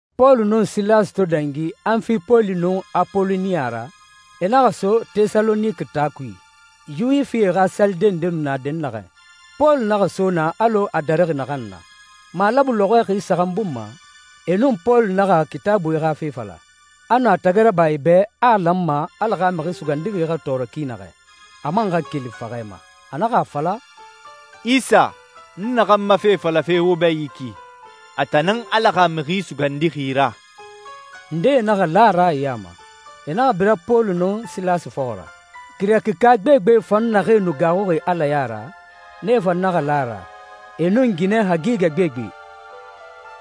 Pɔlu nun Silasi to dangi Anfipoli nun Apoloniya ra, e naxa so Tɛsaloniki taa kui, Yuwifie xa salide nde nu na dɛnnaxɛ. Pɔlu naxa so naa alɔ a darixi naxan na. Malabu lɔxɔɛ xi saxan bun ma, e nun Pɔlu naxa Kitaabui xa fe fala. A nu a tagi raba e bɛ a a lanma Ala xa Mixi Sugandixi xa tɔɔrɔ ki naxɛ, a man xa keli faxɛ ma. A naxa a fala, «Isa, n naxan ma fe falafe wo bɛ yi ki, a tan nan Ala xa Mixi Sugandixi ra.» Ndee naxa la a ra e ya ma. E naxa bira Pɔlu nun Silasi fɔxɔ ra. Girɛkika gbegbe fan naxee nu gaaxuxi Ala ya ra, nee fan naxa la a ra, e nun ginɛ hagigɛ gbegbe.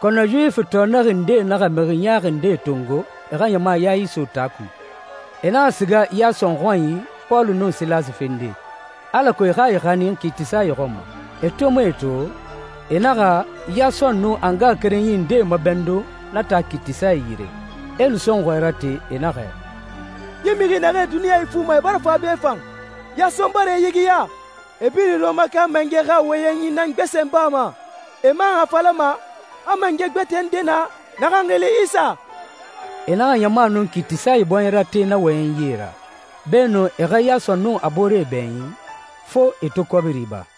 Kɔnɔ Yuwifi tɔɔnɛxi ndee naxa mixi ɲaaxi ndee tongo e xa ɲama ya iso taa kui. E naxa siga Yason xɔnyi Pɔlu nun Silasi fende alako e xa e xanin kiitisae xɔn ma. E to mu e to, e naxa Yason nun a ngaxakerenyie ndee mabɛndun na taa kiitisae yire. E nu sɔnxɔɛ rate, e naxɛ, «Yi mixie naxee duniɲa ifuma, e bara fa be fan. Yason bara e yigiya. E birin Rɔmaka mangɛ xa wɔyɛnyi nan gbesen bama, e man a falama a mangɛ gbɛtɛ nde na naxan xili Isa.» E naxa ɲama nun kiitisae bɔɲɛ rate na wɔyɛnyie ra. Beenun e xa Yason nun a booree bɛɲin, fo e to kɔbiri ba.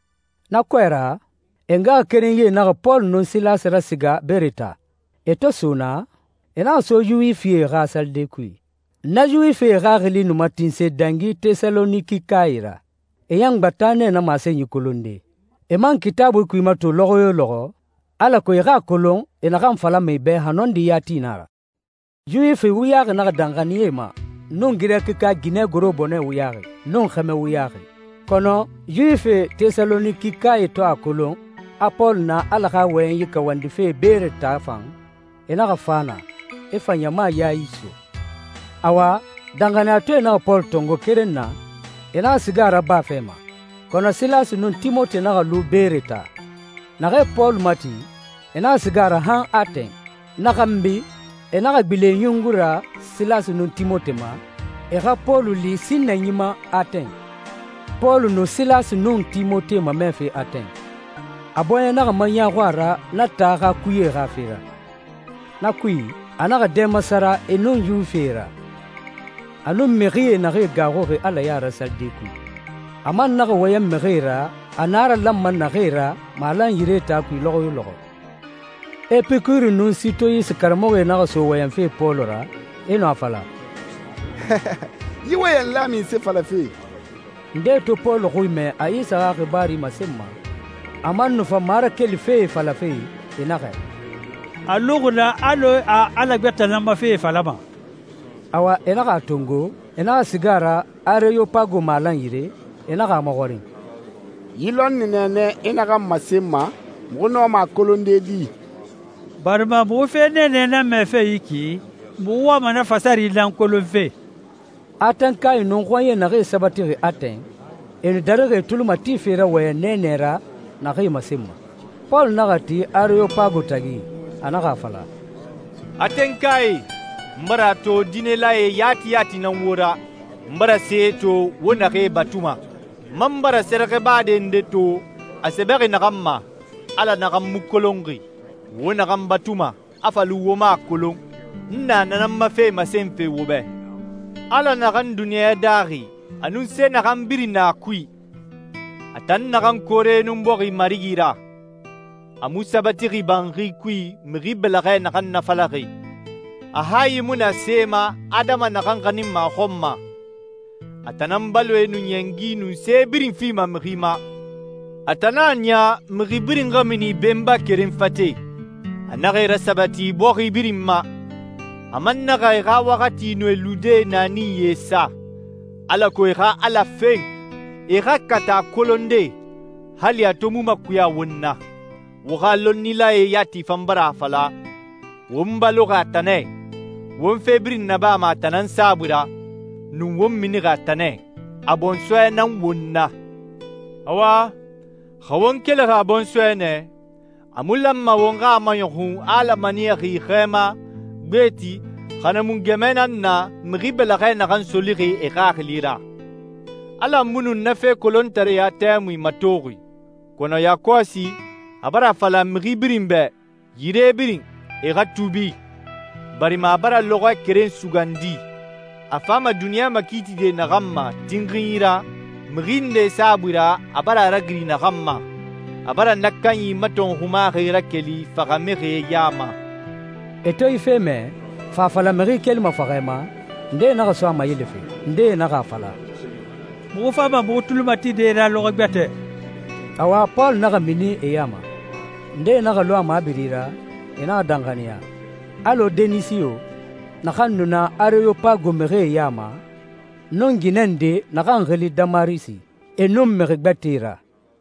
Na kɔɛ ra, e ngaxakerenyie naxa Pɔlu nun Silasi rasiga Beere taa. E to so naa, e naxa so Yuwifie xa salide kui. Na Yuwifie xaxili nu matinse dangi Tɛsalonikikae ra. E ɲan gbata nɛ na masenyi kolonde, e man Kitaabui kui mato lɔxɔ yo lɔxɔ alako e xa a kolon e naxan falama e bɛ xa nɔndi yati nan a ra. Yuwifi wuyaxi naxa danxaniya e ya ma, nun Girɛkika ginɛ gorobonɛ wuyaxi, nun xɛmɛ wuyaxi. Kɔnɔ Yuwifie Tɛsalonikikae to a kolon a Pɔlu na Ala xa wɔyɛnyi kawandife Beere taa fan, e naxa fa naa, e fa ɲama ya iso. Awa, danxaniyatɔɛe naxa Pɔlu tongo keren na, e naxa siga a ra baa fɛ ma, kɔnɔ Silasi nun Timote naxa lu Beere taa. Naxee Pɔlu mati, e naxa siga a ra han Atɛn. Na xanbi e naxa gbilen e ɲungui ra Silasi nun Timote xɔn ma, e xa Pɔlu li sinnanyi ma Atɛn. Pɔlu nu Silasi nun Timote mamɛfe Atɛn. A bɔɲɛ naxa maɲaaxu a ra na taa xa kuyee xa fe ra. Na kui, a naxa dɛ masara e nun Yuwifie ra, a nun mixie naxee gaaxuxi Ala ya ra salide kui. A man naxa wɔyɛn mixie ra a naralanma naxee ra malan yire taa kui lɔxɔ yo lɔxɔ. Epikuri nun Sitoyisi karamɔxɔe naxa so wɔyɛnfe Pɔlu ra, e nu a fala, «Yi wɔyɛnla munse falafe?» Ndee to Pɔlu xui mɛ a Isa xa xibaaru masenma, a man nu fa marakeli fee falafe, e naxɛ, «A luxi nɛ alɔ a ala gbɛtɛe nan ma fee falama.» Awa, e naxa a tongo, e naxa siga a ra Areyopago malan yire, e naxa a maxɔrin, «Yi lɔnni nɛɛnɛ i naxan masenma, muxu nɔma a kolonde di? Barima muxu fe nɛɛnɛ nan mɛfe yi ki, muxu wama na fasari nan kolonfe.» Atɛnkae nun xɔɲɛe naxee sabatixi Atɛn, e nu darixi e tuli matife ra wɔyɛn nɛɛnɛ ra naxee masenma. Pɔlu naxa ti Areyopago tagi, a naxa a fala, «Atɛnkae, n bara a to diinɛlae yati yati nan wo ra. N bara see to wo naxee batuma. N man bara sɛrɛxɛbade nde to, a sɛbɛxi naxan ma, ‹Ala naxan mu kolonxi!› Wo naxan batuma, a fa lu wo mu a kolon, n na nan ma fe masenfe wo bɛ. Ala naxan duniɲa daaxi, a nun se naxan birin na a kui, a tan naxan koore nun bɔxi Marigi ra, a mu sabatixi banxi kui mixi bɛlɛxɛ naxan nafalaxi. A hayi mu na see ma adama naxan xaninma a xɔn ma. A tan nan baloe nun ɲɛngi nun se birin fima mixi ma. A tan nan a niya mixi birin xa mini benba keren fate. A naxa e rasabati bɔxi birin ma. A man naxa e xa waxati nun e lude naaninyie sa, alako e xa Ala fen, e xa kata a kolonde, hali a to mu makuya won na. Wo xa lɔnnilae yati fan bara a fala, ‹Won baloxi a tan nɛ, won fe birin nabama a tan nan saabui ra, nun won minixi a tan nɛ. A bɔnsɔɛ nan won na.› Awa xa won kelixi a bɔnsɔɛ nɛ, a mu lanma won xa a maɲɔxun a Ala maniyaxi xɛɛma, gbeti, xa na mu gɛmɛ nan na, mixi bɛlɛxɛ naxan solixi e xaxili ra. Ala mu nu na fe kolontareya tɛmui matoxi, kɔnɔ yakɔsi a bara a fala mixi birin bɛ, yire birin, e xa tuubi, barima a bara lɔxɔɛ keren sugandi, a fama duniɲa makiitide naxan ma tinxinyi ra, mixi nde saabui ra a bara a ragiri naxan ma. A bara na kanyi matɔnxumaxi rakeli faxamixie ya ma.» E to yi fe mɛ, fa a fala mixi kelima faxɛ ma, ndee naxa so a mayelefe. Ndee naxa a fala, «Muxu fama muxu tuli matide i ra lɔxɔɛ gbɛtɛ.» Awa, Pɔlu naxa mini e ya ma. Ndee naxa lu a mabiri ra, e naxa danxaniya, alɔ Denisiyo, naxan nu na Areyopago mixie ya ma, nun ginɛ nde naxan xili Damarisi, e nun mixi gbɛtɛe ra.